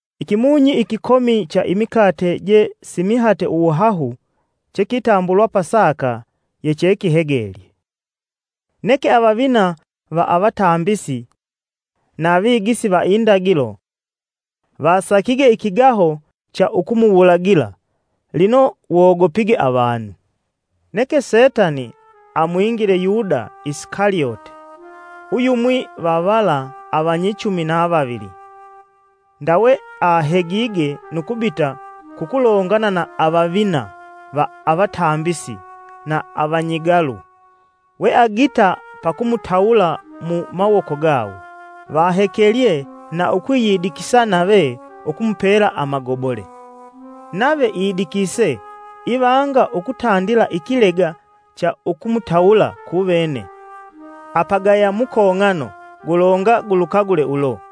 Ikimunyi ikikomi cha imikate je simihate uwuhahu, chekitambulwa Pasaka, yechekihegelye. Neke avavina va avatambisi na vigisi va indagilo, vasakige ikigaho cha ukumuwulagila lino wogopige avanu. Neke Setani amwingile Yuda Isikalyote, uyumwi va vala avanyichumi na vavili. Ndawe ahegige nu kubita kukulongana na avavina va avatambisi na avanyigalu, weagita pakumutawula mu mawoko gawo. Vahekelye na ukwiyidikisa nave ukumupela amagobole. Nave idikise ivanga ukutandila ikilega cha ukumutawula kuvene apagaya mukong'ano gulonga gulukagule ulo.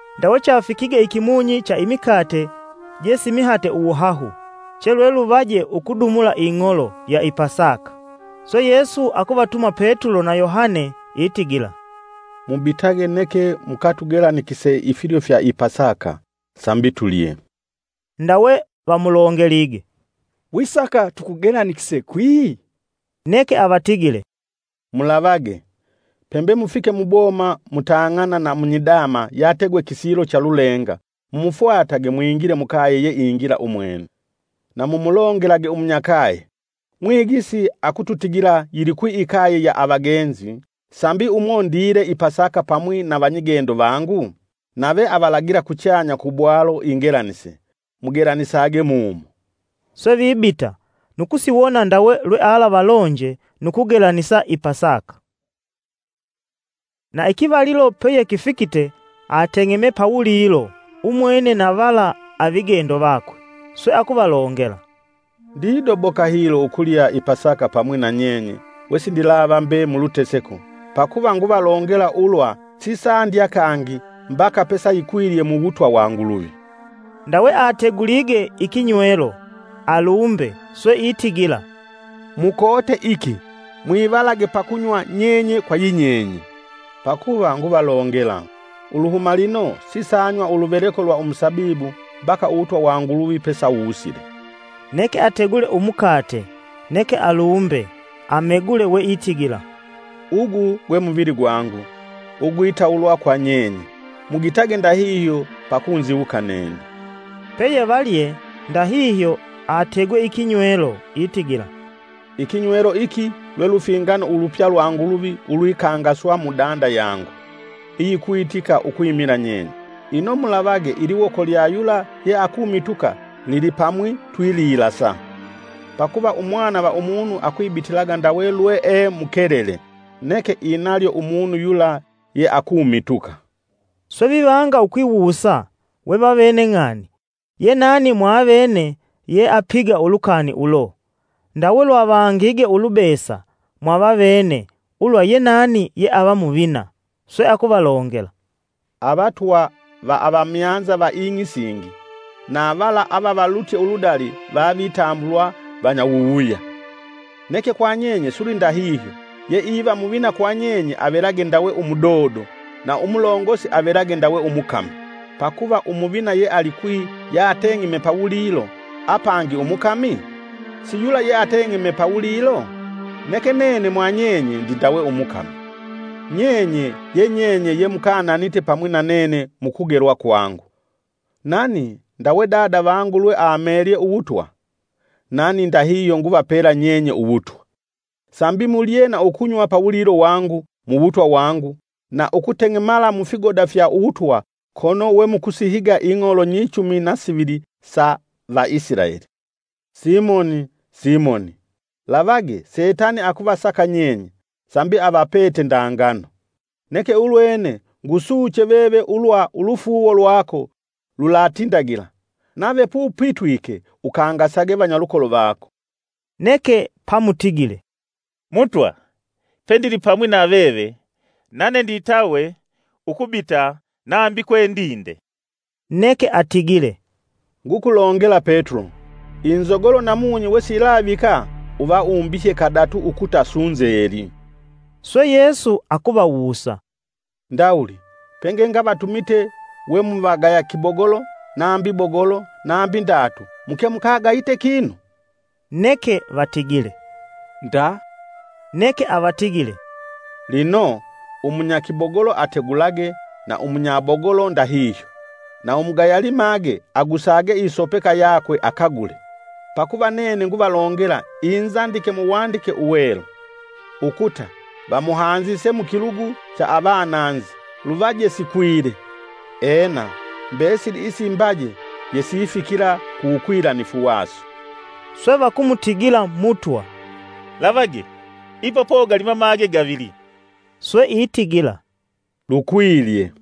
Ndawe chafikige ikimunyi cha imikate je simihate uwuhahu, che lweluvaje ukudumula ing'olo ya i Pasaka. Swe Yesu akuvatuma Petulo na Yohane itigila, “Mubitage neke mukatugelanikise ifilyo fya i Pasaka, sambi tulye.” Ndawe vamulongelige, “Wisaka tukugelanikise kwi?” Neke avatigile “Mulavage, pembe mufike muboma, mutang'ana na munyidama yategwe kisilo cha lulenga mumufwatage mwingile mukaye yeingila umwene. Na mumulongelage umunyakaye, ‘Mwigisi akukutigila, yilikwi ikaye ya avagenzi, sambi umo ndile i Pasaka pamwi na vanyigendo vangu?’ Nave avalagila kuchanya ku bwalo ingelanise, mugelanisage mumo.” Swe vibita, nu kusiwona ndawe lwealavalonje; nu kugelanisa i Pasaka. Na ikivalilo peyekifikite, ateng'eme pawulilo umwene na vala avigendo vakwe. Swe akuvalongela, “Ndidoboka hilo ukulya i Pasaka pamwi na nyenye wesindilava mbe muluteseko, pakuva nguvalongela ulwa sisandya kangi mbaka pesayikwilye mu wutwa wa Nguluvi.” Ndawe ategulige ikinywelo, alumbe swe itigila, “Mukote iki, mwivalage pakunywa nyenye kwa yinyenye. Pakuva nguvalongela, uluhuma lino sisanywa uluveleko lwa umusabibu mbaka uwutwa wa Nguluvi pesawusile.” Neke ategule umukate, neke alumbe, amegule we itigila, “Ugu gwe muvili gwangu, [ugwitawulwa kwa nyenye. Mugitage ndahihyo pa kunziwuka nene.” Peyevalye ndahihyo ategwe ikinywelo itigila, “Ikinywelo iki lwe lufingano ulupya lwa Nguluvi ulwikangaswa mudanda yangu, iyikwitika ukwimila nyenye.] “Ino mulavage iliwoko lya yula yeakumituka lilipamwi twililasa. Pakuva Umwana va Umunu akwibitilaga ndawe lwee mukelele, neke inalyo umunu yula yeakumituka.” Swe vivanga ukwiwusa we vavene ng'ani ye nani mwavene yeapiga ulukani ulo. Ndawe lwavangige ulubesa mwavavene ulwa ye nani yeava muvina. Swe akuvalongela, “Avatwa va avamyanza va ing'i isingi, na vala avavalutye uludali vavitambulwa vanyawuwuya. Neke kwa nyenye silwindahihyo yeiva muvina kwanyenye avelage ndawe umudodo, na umulongosi avelage ndawe umukami. Pakuva umuvina yealikwi yateng'eme pawulilo, apangi umukami? Si yula yeateng'eme pawulilo? Neke nene mwanyenye ndindawe umukami. “Nyenye ye nyenye ye mukananite pamwi na nene mukugelwa kwangu; nani ndawe Dada vangu lweamelye uwutwa, nani ndahihyo nguvapela nyenye uwutwa. Sambi mulye na ukunywa pawulilo wangu muwutwa wangu, na ukuteng'emala mufigoda fya uwutwa kono we mukusihiga ing'olo nyichumi na sivili sa Vaisilaeli. “Simoni, Simoni! Lavage! Setani akuvasaka nyenye, sambi avapete nda ngano. Neke ulwene ngusuche veve ulwa ulufuuwo lwako lulatindagila, nave pupitwike ukangasage vanyalukolo vako.” Neke pamutigile, “Mutwa pendilipamwi na veve nane nditawe ukubita nambi kwe ndinde.” Neke atigile, “Ngukulongela Petulo, inzogolo namunyi wesiyilavika uva umbihye kadatu ukuta sunzeli.” Swe Yesu akuvawusa, “Ndawuli pengengavatumite we muvagaya kibogolo nambi bogolo nambi ndatu muke mukagayite kinu?” Neke vatigile, “Nda.” Neke avatigile, “Lino, umunya kibogolo ategulage na umunyabogolo ndahihyo. Na umugaya limage agusage isopeka yakwe akagule. Pakuva nene nguvalongela inzandike muwandike uwelu; ‘Ukuta vamuhanzise mukilugu cha avananzi, luvaje sikwile. Ena, mbesili isimbaje yesifikila ku wukwilanifu waso,” Swe vakumutigila Mutwa, “Lavage, ipa pogali mamage gavili.” Swe itigila, “Lukwilye!”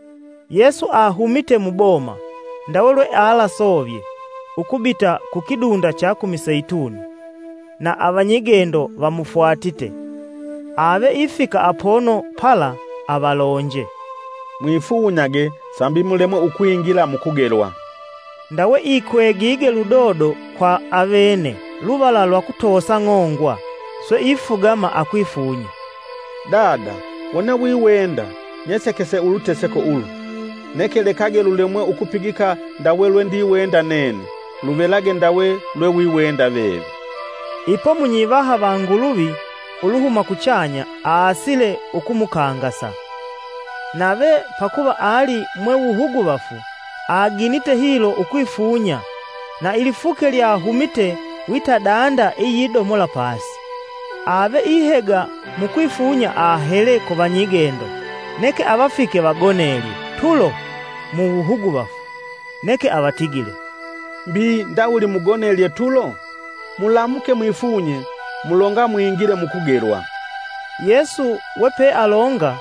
Yesu ahumite muboma, ndawe lwealasovye ukubita kukidunda cha ku Miseituni; na avanyigendo vamufwatite. Ave ifika apono pala avalonje, “Mwifunyage sambi mulemwe ukwingila mukugelwa.” Ndawe ikwegige ludodo kwa avene luvala lwa kutosa ng'ongwa swe ifugama akwifunya. “Dada wone wiwenda, nyesekese uluteseko ulu, neke lekage lulemwe ukupigika ndawe lwendiwenda nene, luvelage ndawe lwe wiwenda veve.” [ Ipo munyivaha va Nguluvi uluhuma kuchanya, aasile ukumukangasa. Nave pakuva ali mwe wuhuguvafu aginite hilo ukwifunya na ilifuke lyahumite wita danda iyidomola pasi.] Ave ihega mukwifunya ahele kuvanyigendo, neke avafike vagonelye tulo mu wuhuguvafu. Neke avatigile, “Mbi ndawuli mugonelye tulo? Mulamuke mwifunye mulonga mwingile mukugelwa.” Yesu we pealonga,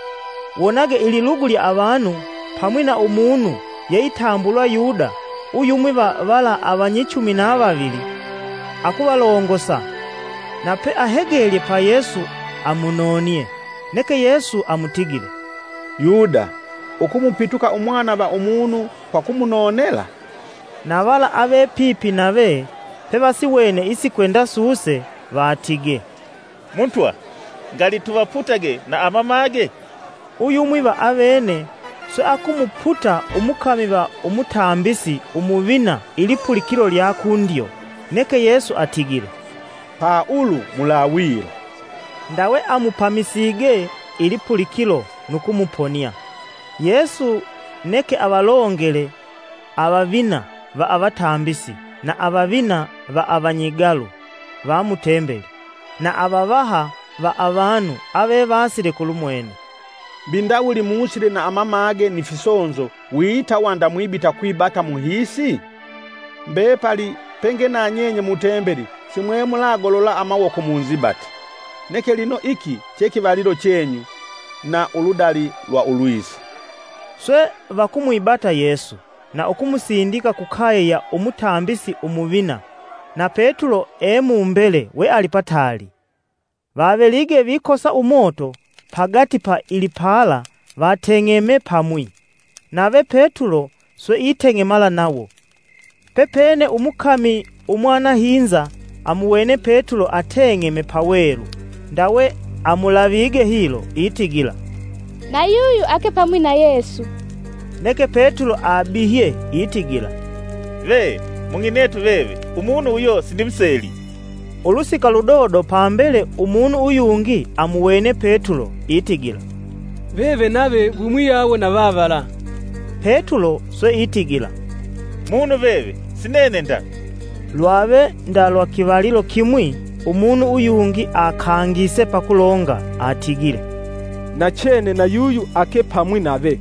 wonage ililugu lya avanu, pamwi na umunu yeitambulwa Yuda uyumwi va vala avanyichumi na vavili, akuvalongosa. Na peahegelye pa Yesu amunonie. Neke Yesu amutigile, “Yuda! Ukumupituka Umwana va Umunu kwa kumunonela?” Na vala avepipi nave pevasiwene isikwenda suse vatigee, “Mutwa, ngali tuvaputage na amamage?” Uyumwi va avene swe akumuputa umukami va umutambisi umuvina ilipulikilo lya kundyo. Neke Yesu atigile, “Pa ulu mulawila!” Ndawe amupamisige ilipulikilo nu kumuponia. Yesu neke avalongele avavina va avatambisi, na avavina va avanyigalu va mu tembeli, na avavaha va avanu avevasile kulumwene, “Mbi ndawuli musile na amamage ni fisonzo wita wanda mwibita kwibata muhiisi? Mbepali penge na nyenye mu tembeli simwe mulagolola amawoko munzibate. Neke lino iki che kivalilo chenyu, na uludali lwa ulwisa.” Swe vakumwibata Yesu na ukumusindika kukaye ya Umutambisi Umuvina, na petulo e mumbele we ali pataali. Vavelige vikosa umoto pagati pa ilipala vateng'eme pamwi, nave petulo swe iteng'emala nawo. Pepene umukami umwanahinza amuwene Petulo ateng'eme pawelu, ndawe amulavige hilo itigila, “Na yuyu ake pamwi na Yesu.” Neke Petulo abihye itigila, “Ve! Mung'inetu veve umunu uyo sindimuseli.” Ulusika ludodo pambele umunu uyungi amuwene Petulo itigila, “Veve nave wimuyawo na vavala.” Petulo swe itigila “Munu veve si nene nda!” Lwave nda lwa kivalilo kimwi umunu uyungi akangise pakulonga atigile, “Nachene na yuyu ake pamwi nave,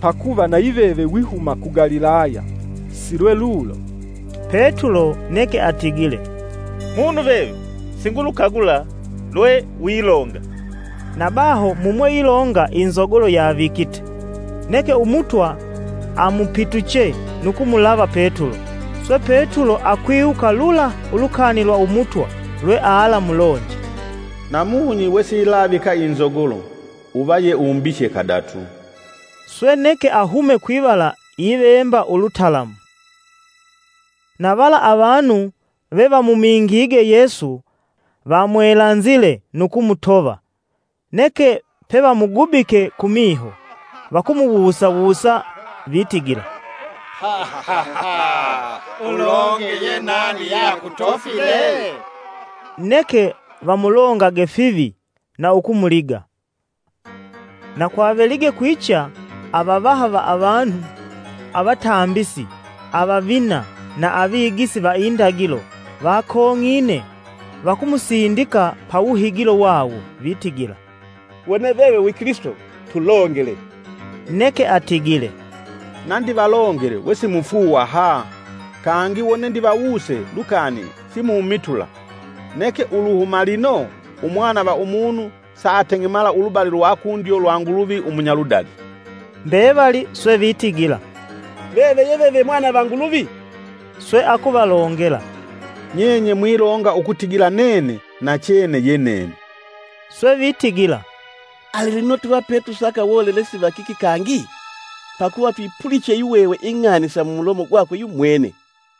pakuva nayiveve wihuma ku Galilaya si lwelulo.” Petulo neke atigile, “Munu veve; singulukagula lwe wilonga!” Na baho mumweilonga, inzogolo yavikite. Neke Umutwa amupituche nu kumulava Petulo. Swe Petulo akwiwuka lula ulukani lwa Umutwa, lwe alaamulonje, “Namunyi wesiyilavika inzogolo, uva ye umbihye kadatu.” Swe neke ahume kwivala ivemba ulutalamu. Na vala avanu vevamumingige Yesu vamwelanzile nu kumutova. Neke pevamugubike kumiho vakumuwusa wusa vitigila, “Ulonge ye nani yeakutofile?” Neke vamulongange fivi na ukumuliga. Na kwavelige kwicha, avavaha va avanu, avatambisi avavina na avigisi va indagilo vakong'ine vakumusindika pawuhigilo wawo vitigila, “Wone veve wi Kilisito! Tulongele.” Neke atigile, “Na ndivalongele we simufuuwa ha! kangi wone ndivawuse lukani simumitula. Neke uluhuma lino, Umwana va Umunu saateng'emala ulubali lwa kundyo lwa Nguluvi umunyaludali.” Mbevali swe vitigila, “Veve ye veve mwana va Nguluvi!” Swe akuvalongela, “Nyenye mwilonga ukutigila nene yenene.” Swe vitigila, “Ali lino tuva petusaka wolelesi wakiki kangi? Pakuva twipuliche yihwehwe ing'ani sa mumulomo gwakwe yumwene.”